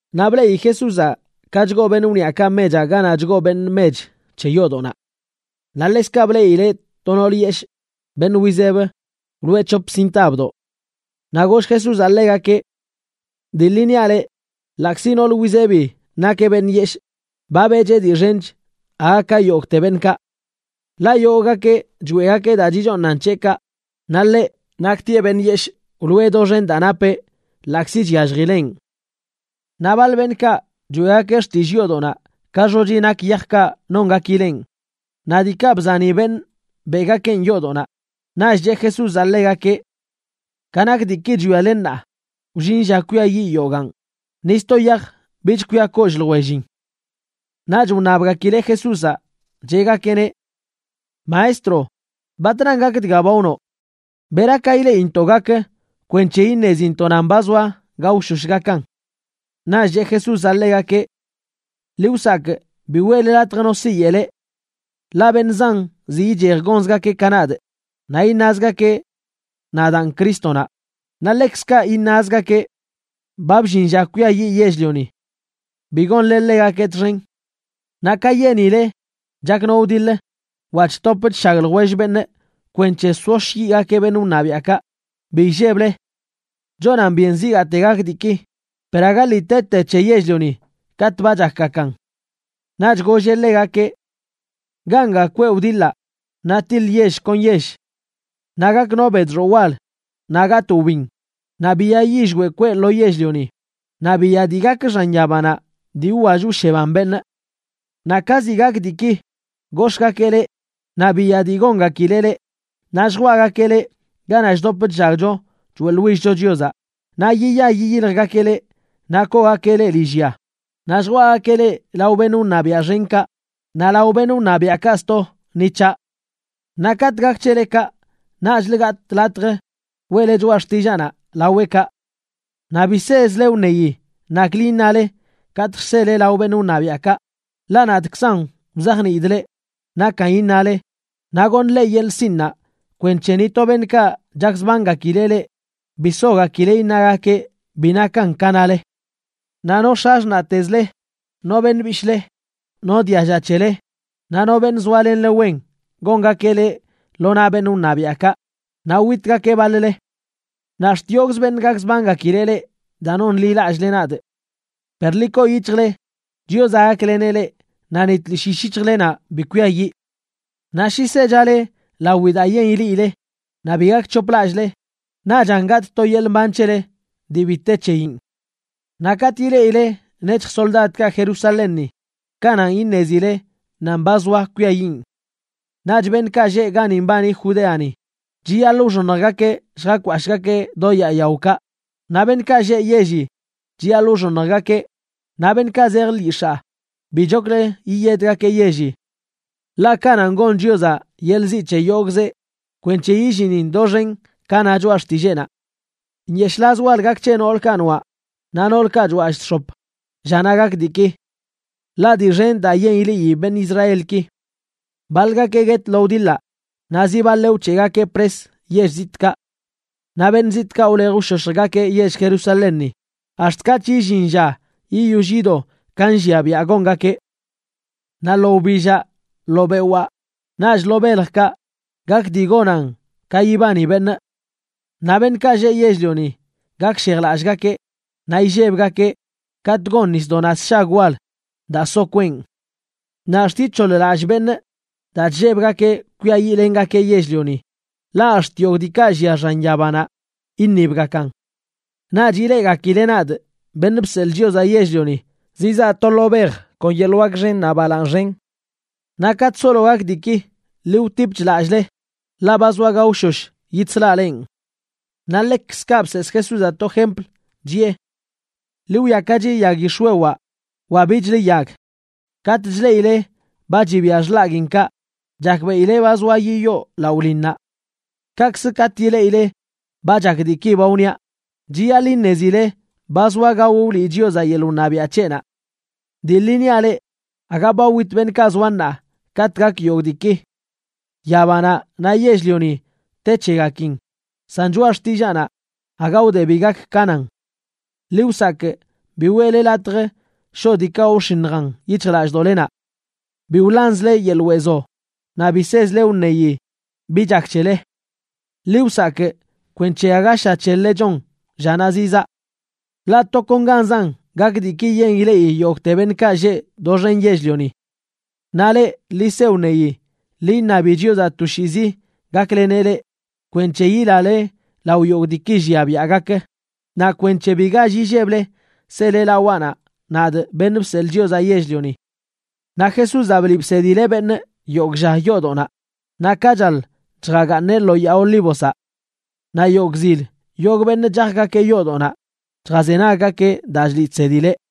Naꞌ bleꞌi Jesúzaꞌ ka chgoo beṉꞌ wniꞌakaꞌ mechaꞌ ganaꞌ chgoo beṉꞌ mech c̱he yoodoꞌnaꞌ. Naꞌ ḻekzkaꞌ bleꞌileꞌ to nool yeshꞌ, beṉꞌ wizeb, wloꞌe c̱hop sintabdoꞌ. Naꞌ goll Jesúzaꞌ ḻegakeꞌ: ―Dii ḻi niaꞌ leꞌ, ḻaꞌkzi nool wizebi nakeꞌ beṉꞌ yeshꞌ, ba beꞌcheꞌ dii xench aga ka yogꞌte beṉꞌkaꞌ. Ḻaꞌ yogꞌgakeꞌ choeꞌgakeꞌ daa chichooṉan c̱heꞌkaꞌ, naꞌ ḻeꞌ, naktieꞌ beṉꞌ yeshꞌ, wloꞌe doxen daa napeꞌ, ḻaꞌkzi chyalljileꞌn. Naꞌ baḻ beṉꞌkaꞌ choeꞌgakeꞌ xtillꞌ yoodoꞌnaꞌ ka xochi nak yajkaꞌ nongakileꞌn naꞌ diikaꞌ bzani beṉꞌ beꞌgakeꞌn yoodoꞌnaꞌ. Naꞌch cheꞌ Jesúzaꞌ ḻegakeꞌ: ―Ka nak diiki chwiale ṉaa, wllin lla kwiayiꞌ yogaan, ni sto yaj bich kwia kollꞌ ljwellin. Naꞌch wṉabgakileꞌ Jesúzaꞌ, cheꞌgakeꞌneꞌ: ―Maestro, ¿batran gak dga ba wnoꞌ? ¿Bera ka ileꞌintoꞌ gak kwenc̱he iṉezintoꞌ nan ba zoa gaoshosh gakan? Naꞌch cheꞌ Jesúzaꞌ ḻegakeꞌ: ―Ḻi wsakꞌ bi weꞌle latj no siyeꞌ leꞌ. Ḻaꞌ beṉꞌ zan zi ichej gonzgakeꞌ ka nadꞌ, naꞌ iṉazgakeꞌ: “Nadaan Crístonaꞌ”, naꞌ ḻekzkaꞌ iṉazgakeꞌ: “Ba bllin lla kwiayiꞌ yell-lioni.” Bi gonle ḻegakeꞌ txen. Naꞌ ka yenile chak no wdiḻ wa chtop chshag ljwell beṉꞌ kwenc̱he soshyiꞌgakeꞌ beṉꞌ wṉabiaꞌkaꞌ, bi illeble. Chonan byen zigaate gak diiki, per aga lii tete c̱he yell-lioni katꞌ ba chakgakan. Naꞌch golleꞌ ḻegakeꞌ: ―Ganga kweꞌ wdiḻaꞌ naꞌ tiḻ yell kon yell. Naꞌ gak no bedxoꞌ wal, naꞌ gatꞌ wbin, naꞌ biya yillweꞌ kweꞌ lo yell-lioni, naꞌ biya dii gak xan yabanaꞌ dii wwall wsheban beṉꞌ. ’Naꞌ ka zi gak diiki, gox̱ꞌgakeꞌ leꞌ naꞌ biya dii gongakileꞌ leꞌ. Naꞌ lljwaꞌgakeꞌ leꞌ ganaꞌ chdop chllagcho choeꞌḻwill-cho Chiozaꞌ naꞌ yiya yiyiljgakeꞌ leꞌ naꞌ koogakeꞌ leꞌ lillya, naꞌ lljwaꞌgakeꞌ leꞌ lao beṉꞌ wṉabiaꞌ xenkaꞌ naꞌ lao beṉꞌ wṉabiaꞌkaꞌ sto ni c̱haꞌ. Naꞌ katꞌ gak c̱hele kaꞌ, naꞌchlə gatꞌ latj weꞌle choꞌa xtillaanaꞌ laweꞌkaꞌ. Naꞌ bi sezle wṉeyi naklə iṉale katꞌ lljsele lao beṉꞌ wṉabiaꞌkaꞌ, ḻaꞌ nadꞌkzan wzajniidꞌ leꞌ nakan iṉale naꞌ goṉꞌ leꞌ yeḻꞌ sinꞌnaꞌ kwenc̱he ni to beṉꞌkaꞌ chakzbangakileꞌ leꞌ bi sogakileꞌ iṉagakeꞌ bi nakan ka nale. Naꞌ no x̱axṉaꞌtezle, no beṉꞌ bishꞌle, no dialla c̱hele, naꞌ no beṉꞌ zoalenle wen gongakeꞌ leꞌ lo naꞌ beṉꞌ wṉabiaꞌkaꞌ, naꞌ witgakeꞌ baḻ-le. Naꞌ ax̱t yogꞌzə beṉꞌ gakzbangakileꞌ leꞌ daa nonḻilallꞌle nadꞌ. Per ḻi koo yic̱hjle, Chiozaꞌ gakleneꞌ leꞌ naꞌ ni tlishꞌ yishꞌ yic̱hjlenaꞌ bi kwiayiꞌ. Naꞌ shi sechale lawi daa yen ileꞌile naꞌ bi gakc̱hoplallꞌle, naꞌchan gatꞌ to yeḻꞌ mban c̱hele dii bi te c̱heyin. ’Naꞌ katꞌ ileꞌile nec̱hj soldadkaꞌ Jerusalénni, kananꞌ iṉezile nan ba zoa kwiayiꞌn. Naꞌch beṉꞌkaꞌ lleꞌ gani mbani Judeani, chiyaḻꞌ wxoṉjgakeꞌ lljakwashꞌgakeꞌ do yaa yaokaꞌ, naꞌ beṉꞌkaꞌ lleꞌ yelli, chiyaḻꞌ wxoṉjgakeꞌ, naꞌ beṉꞌkaꞌ zej lyix̱aa, bichoklə yiyedgakeꞌ yelli. Ḻaꞌ kananꞌ gon Chiozaꞌ yeḻꞌ ziꞌ c̱he yogꞌzeꞌ kwenc̱he yillinin doxen ka na Choꞌa Xtilleenaꞌ. ¡Nyeshꞌlaz wal gak c̱he noolkaꞌ noaꞌ naꞌ noolkaꞌ chwallꞌ chx̱op llanaꞌ gak diiki! Ḻaꞌ dii xen daa yen ileꞌi beṉꞌ Israelki. Baḻgakeꞌ guet lo wdiḻaꞌ naꞌ zi baḻeꞌ wc̱heꞌgakeꞌ pres yell zitꞌkaꞌ. Naꞌ beṉꞌ zitꞌkaꞌ wlej wshoshjgakeꞌ yell Jerusalénni ax̱t katꞌch illin lla yiyoll yido ka llia biaꞌ gongakeꞌ. ’Naꞌ lo wbillaꞌ, lo bewaa naꞌch lo beljkaꞌ gak dii gonan ka yibani beṉꞌ. Naꞌ beṉꞌkaꞌ lleꞌ yell-lioni gakshejlallꞌgakeꞌ naꞌ illebgakeꞌ katꞌ gon nisdoꞌnaꞌ sshag wal daa soꞌ kweꞌn. Naꞌ ax̱t ic̱hoḻ-lallꞌ beṉꞌ daa chllebgakeꞌ kwiayiꞌlengakeꞌ yell-lioni, ḻaꞌ ax̱t yogꞌ diikaꞌ llia xan yabanaꞌ iṉibgakan. Naꞌch ileꞌgakileꞌ nadꞌ, Beṉꞌ Bseḻꞌ Chiozaꞌ Yell-lioni, zizaa to lo bej kon yeḻꞌ wak xen naꞌ balaaṉ xen. Naꞌ katꞌ solo gak diiki, ḻi wtipch lallꞌle, ḻaꞌ ba zoa gaoshosh yidslaꞌ lenꞌ. Naꞌ ḻekzkaꞌ bseesꞌ Jesúzaꞌ to jempl chiꞌe: ―Ḻi wwiakachi yag yix̱wewaꞌ wa bichlə yag. Katꞌ chleꞌile ba chibia xḻaguiinkaꞌ, chakbeꞌile ba zoa yiyoo laꞌo linnaꞌ. Kaꞌkzə, katꞌ ileꞌile ba chak diiki ba wniaꞌ, chiyaḻꞌ iṉezile ba zoa gao wliꞌ Chiozaꞌ yeḻꞌ wṉabiaꞌ c̱heꞌnaꞌ. ’Dii ḻi niaꞌ leꞌ, aga ba wit beṉꞌkaꞌ zoa ṉaa katꞌ gak yogꞌ diiki. ’Yabanaꞌ naꞌ yell-lioni te c̱hegakin, san choꞌa xtillaanaꞌ aga wde bi gak ka nan. ’Ḻi wsakꞌ bi weꞌle latj shoꞌ diikaꞌ wxiṉjan yic̱hjlallꞌdoꞌlenaꞌ. Bi wḻanzle yeḻꞌ weezo, naꞌ bi sezle wṉeyi bi chak c̱hele. Ḻi wsakꞌ kwenc̱he aga sha c̱hel-le chon llanaꞌ zizaa. Ḻaꞌ tokonganzan gak diiki yen ileꞌi yogꞌte beṉꞌkaꞌ lleꞌ doxen yell-lioni. Naꞌ leꞌ, ḻi se wṉeyi, ḻi iṉabi Chiozaꞌ toshiizi gakleneꞌ leꞌ kwenc̱he yilale lao yogꞌ diiki llia biaꞌ gak, naꞌ kwenc̱he bi gall illeble sele lawaꞌnaꞌ, nadꞌ, Beṉꞌ Bseḻꞌ Chiozaꞌ Yell-lioni. Naꞌ Jesúzaꞌ bliꞌ bsedileꞌ beṉꞌ yogꞌ lla yoodoꞌnaꞌ, naꞌ ka chaḻ, chjagaaṉeꞌ lo Yaa Olívozaꞌ. Naꞌ yogꞌ zil yogꞌ beṉꞌ chajgakeꞌ yoodoꞌnaꞌ chjazenaggakeꞌ daa chliꞌ chsedileꞌ.